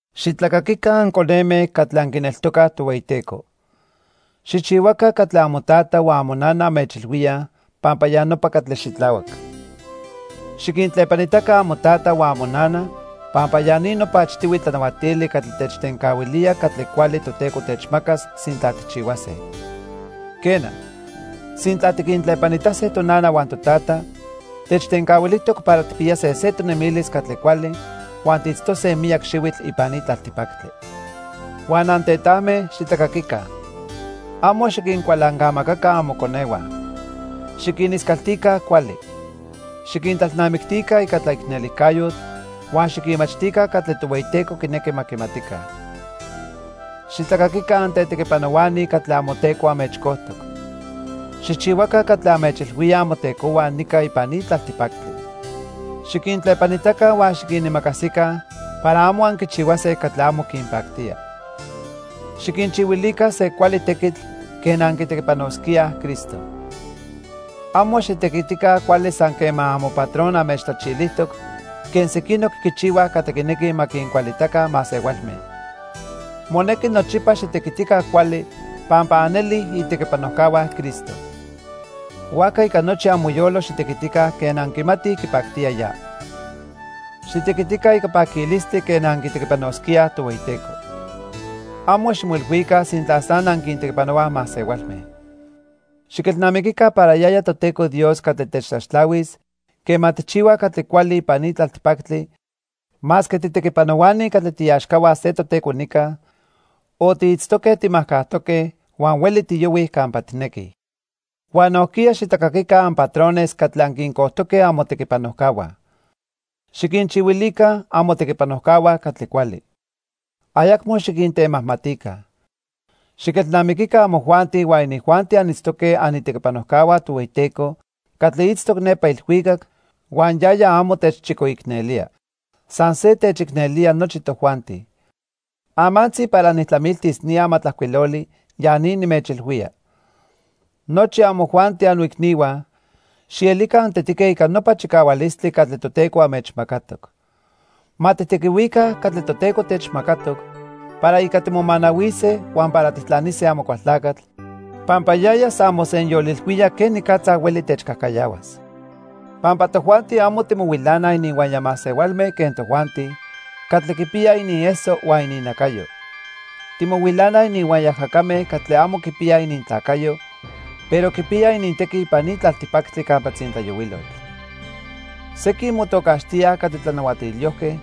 Xitlacaquica anconeme catli anquineltocaj Tohueyiteco. Xijchihuaca catli amotata huan amonana anmechilhuíaj pampa ya nopa catli xitlahuac. Xiquintlepanitaca amotata huan amonana pampa ya ni nopa achtihui tlanahuatili catli techtencahuilía catli cuali Toteco techmacas sintla tijchihuase. Quena, sintla tiquintlepanitase tonana huan totata, techtencahuilijtoc para tijpiyase se tonemilis catli cuali huan tiitztose miyac xihuitl ipan ni tlaltipactli. Huan antetajme, xitlacaquica. Amo xiquincualancamacaca amoconehua. Xiquiniscaltica cuali. Xiquintlalnamictica ica tlaicnelijcayotl huan xiquinmachtica catli Tohueyiteco quinequi ma quimatica. Xitlacaquica antetequipanohuani catli amoteco anmechcojtoc. Xijchihuaca catli anmechilhuíaj amotecohua nica ipan ni tlaltipactli. Xiquintlepanitaca huan xiquinimacasica para amo anquichihuase catli amo quinpactía. Xiquinchihuilica se cuali tequitl quen anquitequipanosquíaj Cristo. Amo xitequitica cuali san quema amopatron anmechtlachilijtoc quen sequinoc quichihuaj catli quinequij ma quincualitaca masehualme. Monequi nochipa xitequitica cuali pampa anelij itequipanojcahua Cristo. Huajca ica nochi amoyolo xitequitica quen anquimatij quipactía ya. Xitequitica ica paquilistli quen anquitequipanosquíaj Tohueyiteco. Amo ximoilhuica sintla san anquintequipanohuaj masehualme. Xiquelnamiquica para yaya Toteco Dios catli techtlaxtlahuis quema tijchihuaj catli cuali ipan ni tlaltipactli masque titequipanohuani catli tiiaxcahua se toteco nica o tiitztoque timajcajtoque huan hueli tiyohuij campa tijnequij. Huan nojquiya xitlacaquica anpatrones catli anquincojtoque amotequipanojcahua. Xiquinchihuilica amotequipanojcahua catli cuali. Ayacmo xiquintemajmatica. Xiquelnamiquica amojuanti huan inijuanti anitztoque anitequipanojcahua Tohueyiteco catli itztoc nepa ilhuicac huan yaya amo techchicoicnelía. San se techicnelía nochi tojuanti. Amantzi para nijtlamiltis ni amatlajcuiloli, ya ni nimechilhuía. Nochi amojuanti, annoicnihua, xielica antetique ica nopa chicahualistli catli Toteco anmechmacatoc. Ma tijtequihuica catli Toteco techmacatoc para ica timomanahuise huan para tijtlanise Amocualtlacatl pampa yaya san mosenyolilhuía quenicatza hueli techcajcayahuas. Pampa tojuanti amo timohuilanaj ininhuaya masehualme quen tojuanti catli quipiyaj inieso huan ininnacayo. Timohuilanaj ininhuaya ajacame catli amo quipiyaj inintlacayo, pero quipiyaj inintequi ipan ni tlaltipactli campa tzintlayohuilotl. Sequin motocaxtíaj catli tlanahuatilyojque,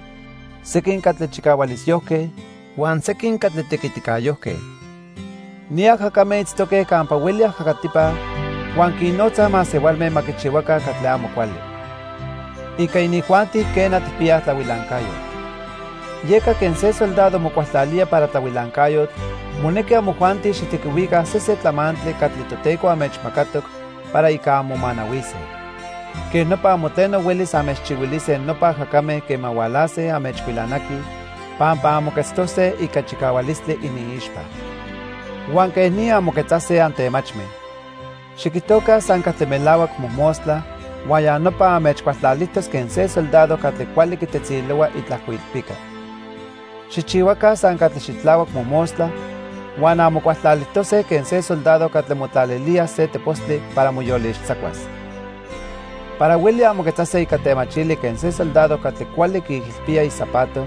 sequin catli chicahualisyojque, huan sequin catli tequiticayojque. Ni ajacame itztoque campa hueli ajacatipa huan quinnotzaj masehualme ma quichihuaca catli amo cuali. Ica inijuanti, quena, tijpiyaj tlahuilancayotl. Yeca quen se soldado mocualtlalía para tlahuilancayotl, monequi amojuanti xijtequihuica sesen tlamantli catli Toteco anmechmacatoc para ica anmomanahuise. Quej nopa amo tleno huelis anmechchihuilise nopa ajacame quema hualase anmechhuilanaquij pampa anmoquetztose ica chicahualistli iniixpa. Huan quej ni anmoquetzase antemachme. Xiquijtoca san catli melahuac mojmostla huan ya nopa anmechcualtlalijtos quen se soldado catli cuali quitetzilohua itlajcoilpica. Xijchihuaca san catli xitlahuac mojmostla huan anmocualtlalijtose quen se soldado catli motlalilía se tepostli para moyolixtzacuas. Para hueli anmoquetzase ica temachili quen se soldado catli cuali quiijilpía izapato,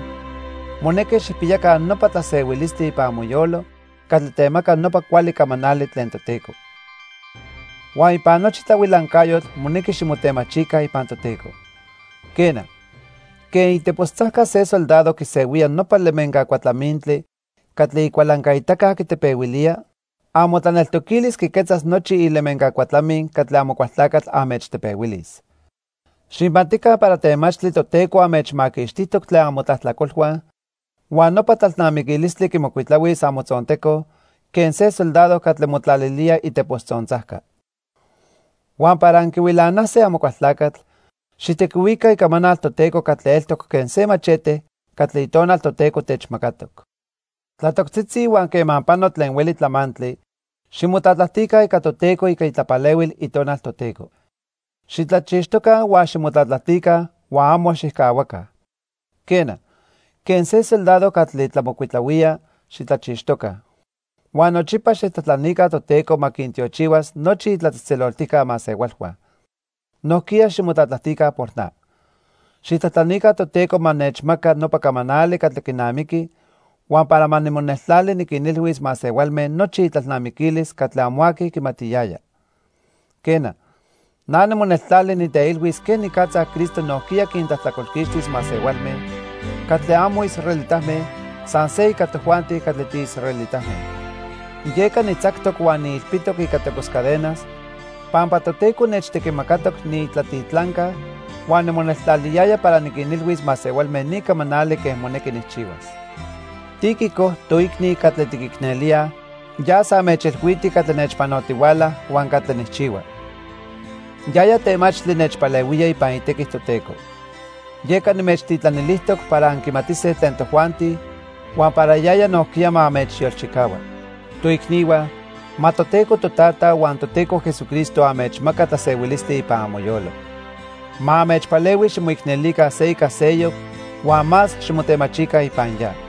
monequi xijpiyaca nopa tlasehuilistli ipan amoyolo catli temaca nopa cuali camanali tlen Toteco. Huan ipan nochi tlahuilancayotl monequi ximotemachica ipan Toteco. Quena, quen itepostzajca se soldado quisehuía nopa lemenca cuatlamintli catli icualancaitaca quitepehuilía, amotlaneltoquilis quiquetzas nochi ilemenca cuatlamin catli Amocualtlacatl anmechtepehuilis. Xijmatica para temachtli Toteco anmechmaquixtijtoc tlen amotlajtlacolhua huan nopa tlalnamiquilistli quimocuitlahuis amotzonteco quen se soldado catli motlalilía itepostzontzajca. Huan para anquihuilanase Amocualtlacatl, xijtequihuica Icamanal Toteco catli eltoc quen se machete catli Itonal Toteco techmacatoc. Tlatoctzitzi huan quema pano tlen hueli tlamantli, ximotlatlajtica ica Toteco ica itlapalehuil Itonal Toteco. Xitlachixtoca huan ximotlatlajtica huan amo xijcahuaca. Quena, quen se soldado catli tlamocuitlahuía, xitlachixtoca. Huan nochipa xijtlajtlanica Toteco ma quintiochihuas nochi itlatzejtzeloltijca masehualhua. Nojquiya ximotlatlajtica por na. Xijtlajtlanica Toteco ma nechmaca nopa camanali catli quinamiqui huan para ma nimoneltlali niquinilhuis masehualme nochi itlalnamiquilis catli amo aqui quimatiyaya. Quena, ma nimoneltlali niteilhuis quenicatza Cristo nojquiya quintlajtlacolquixtis masehualme catli amo israelitame san se ica tojuanti catli tiisraelitame. Yeca nitzactoc huan niilpitoc ica tepos cadenas pampa Toteco nechtequimacatoc niitlatitlanca huan nimoneltlaliyaya para niquinilhuis masehualme ni camanali quen monequi nijchihuas. Tíquico, toicni catli tiquicnelíaj yas anmechilhuiti catli nechpanotihuala huan catli nijchihua. Yaya temachtli nechpalehuía ipan itequi Toteco. Yeca nimechtitlanilijtoc para anquimatise tlen tojuanti huan para yaya nojquiya ma anmechyolchicahua. Toicnihua, ma Toteco Totata huan Toteco Jesucristo anmechmaca tlasehuilistli ipan amoyolo. Ma anmechpalehui ximoicnelica se ica seyoc huan más ximotemachica ipan ya.